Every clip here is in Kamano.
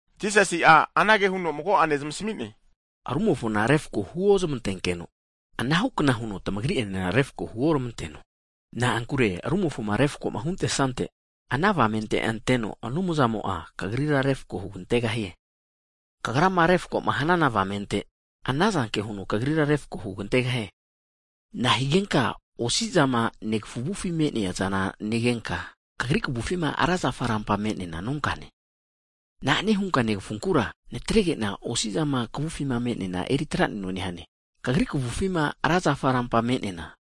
Jisasi'a anage huno mago'ane zamasmi'ne, rumofona refako huo zamantenkeno, anahu kna huno tmagri e'nena refako huormanteno. Na'ankure rumofoma refako huntesante, ana avamente Anumzamo'a kagrira refako hugantegahie. Kagrama rumofoma refakoma hanana avamente, anazanke huno kagrira refako hugantegahie. Nahigenka osi zama negafu avufima me'neazana negenka, kagri kavufima ra zafa rampama me'neana nonkane? Na'ane hunka negafunkura, natregena osi'zama kavufi me'neana eri traneno nehane, kagri kavufi'ma ra zafa rampama me'neana?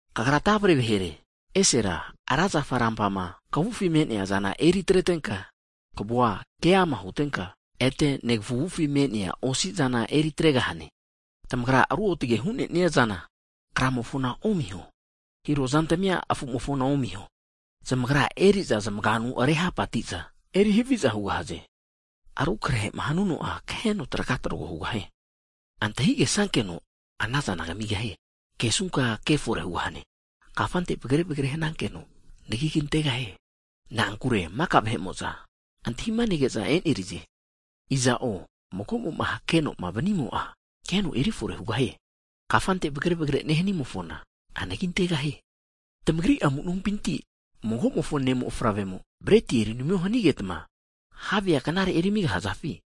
Kagra tavre vahere, esera ra zafa ranpama kavufi me'neazana eriatrenka kavua keama hutenka, ete negafu avufi me'nea osi'zana eri atregahane. Tamagra ruotage hu'neniazana kramofona omiho, hiro zantmi'a afumofona omiho, zamagra eri'za zamagianu rehapa atiza eri haviza hugahaze. Arukrehema hanuno'a kaheno traga trogo hugahie. Antahigesankeno anazana kamigahie, hakesunka kefore hugahane, kafante vagre vagre hanankeno, anagi kantegahie. Na'ankure maka vahe'mo'za antahima nege'za e'nerize. Iza'o, hake'noma vanimo'a, keno eri fore hugahie. Kafante vagre vagre nehnimofona, anagi antegahie. Tamagri amu nompinti magomofo ne' mofavremo, breti eri namio hanigetma, havea knare eri amigahzafi?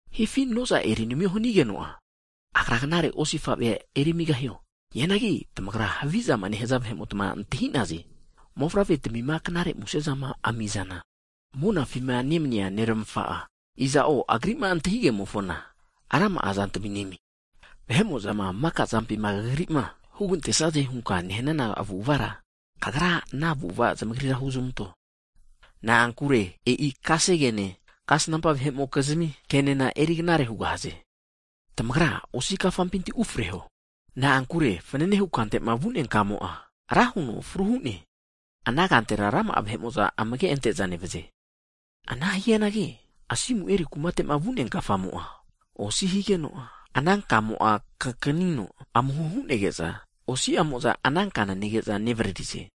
Hifi noza eri namio hanigeno'a, agra knare osifavea eri amigahio? Hianagi tamagra havizama nehaze vahe'mota antahi'naze, mofavre'tmima knare muse'zama ami'zana, monafima nemnia Neramafa'a, knare muse'za, iza'o Agri'ma antahigemofona rama'a zantmi nemie! vahe'mo'zama maka zampima kagrima, hugantesaze hunka nehnana avu'avara, kagra ana avu'ava zamagrira huzmanto. Na'ankure e'i kasegene kasnampa vahe'mokizmi kenena eri knare hugahaze. Tamagra osi kafampinti ufreho, na'ankure fananehu kantema vu'nea kamo'a, ra huno fru hu'ne. Ana kantera rama'a vahe'mo'za amage ante'za nevaze. Ana hianagi asimu eri kumate vu'nea kafamo'a osi higeno, ana kamo'a kakanino amuho hu'nege'no, osi'amoza ana kana nege'za nevaririze.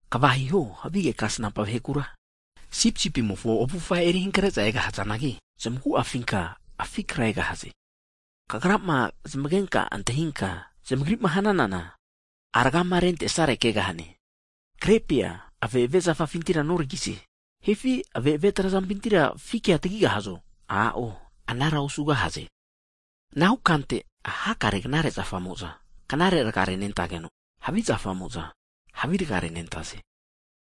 Kva hiho havige kasnampa vahekura, sipisipimofo avufa erihankre'za egahzanagi, zamagu'afinka afi kra egahaze. Kagrama zamagenka, antahinka zamagrima hananana, rgama rentesare kegahane, krepia ave'ave zafafinti noragize, hifi ave'ave trazampinti fikia tagigahazo? A'o, anara osugahaze. Anahu kante hakare Knare zafamo'za, knare rga renetageno, havi zafamo'za havi rga renentaze.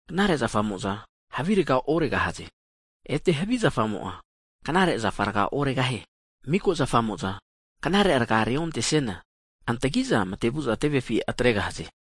Knare zafamo'za havi rga oregahaze, ete havi zafamo'a knare zafa rga oregahie. Miko zafamo'za, knare rga reontesiana, antagiza matevu'za tevefi atregahaze.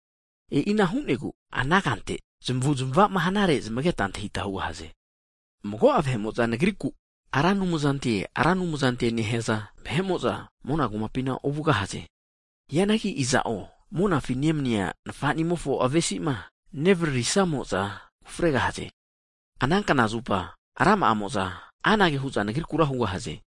E'ina hu'negu ana kante, zamavu'zmavama hanare zmageta antahita hugahaze. Mago'a vahe'mo'za Nagriku, Ra Anumzanti, Ra Anumzantie nahaza vahe'mo'za, mona kumapina ovugahaze. Hianagi iza'o monafi nemnia Nfanimofi avesi'ma nevariri'samo'za ufregahaze. Ana knazupa rama'amo'za anage hu'za Nagrikura hugahaze.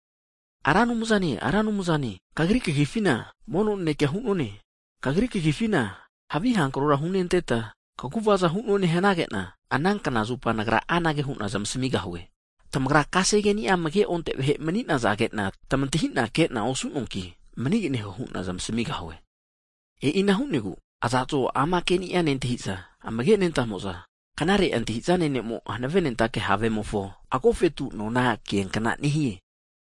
Ra Anumzane, Ra Anumzane, Kagri kagifina mono nanekea hu'none, Kagri kagifina havi hankrora hunenteta, kaguvaza (mirakol) hu'nonane hanagena, ana knazupa Nagra anage hu'na zamasmigahue, tamagra kasegeni'a amage'onte vahe mani'nazagena tmatahina kena osunoanki, maniganeho hu'na zamasmigahue. E'ina hu'negu, iza'zmo ama keni'a nentahi'za amage nentamo'za, knare antahizane ne'mo hanave nentake havemofo, agofetu nona kiankna nehie.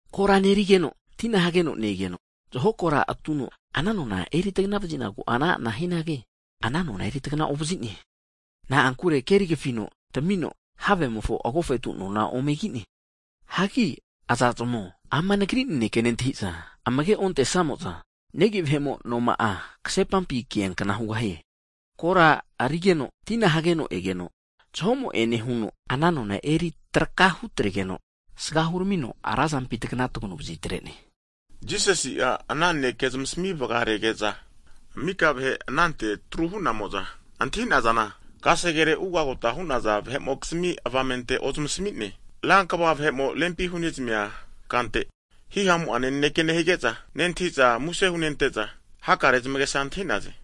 Kora nerigeno, tina hageno ne-egeno, zaho kora atuno ana nona eri tagna vazinaku ana'ana hianagi, ana nona eri tagna ovazi'ne, Na'ankure keri kafino tamino havemofo agofetu nona ome ki'ne. Hagi iza'zmo, ama Nagri naneke nentahiza amage onte'samo'za, negi vahe'mo noma'a ksepampi kia kna hugahie. Kora arigeno, tina hageno egeno, zahomo'ene huno ana nona eri traka hutregeno asaga huramigeno, razampi tagana taganu vazi'atre'ne. Jisasi'a ana naneke zamasmi vgarege'za mika vahe anante atru hu'namo'za antahi'nazana, kasegere ugagota hu'naza vahe'mokizmi avamente ozmasmi'ne. Rankva vahe'mo rempi hunezamia kante, hihamu'ane naneke nehige'za nentahi'za muse hunente'za, hakare zamagesa antahi'naze.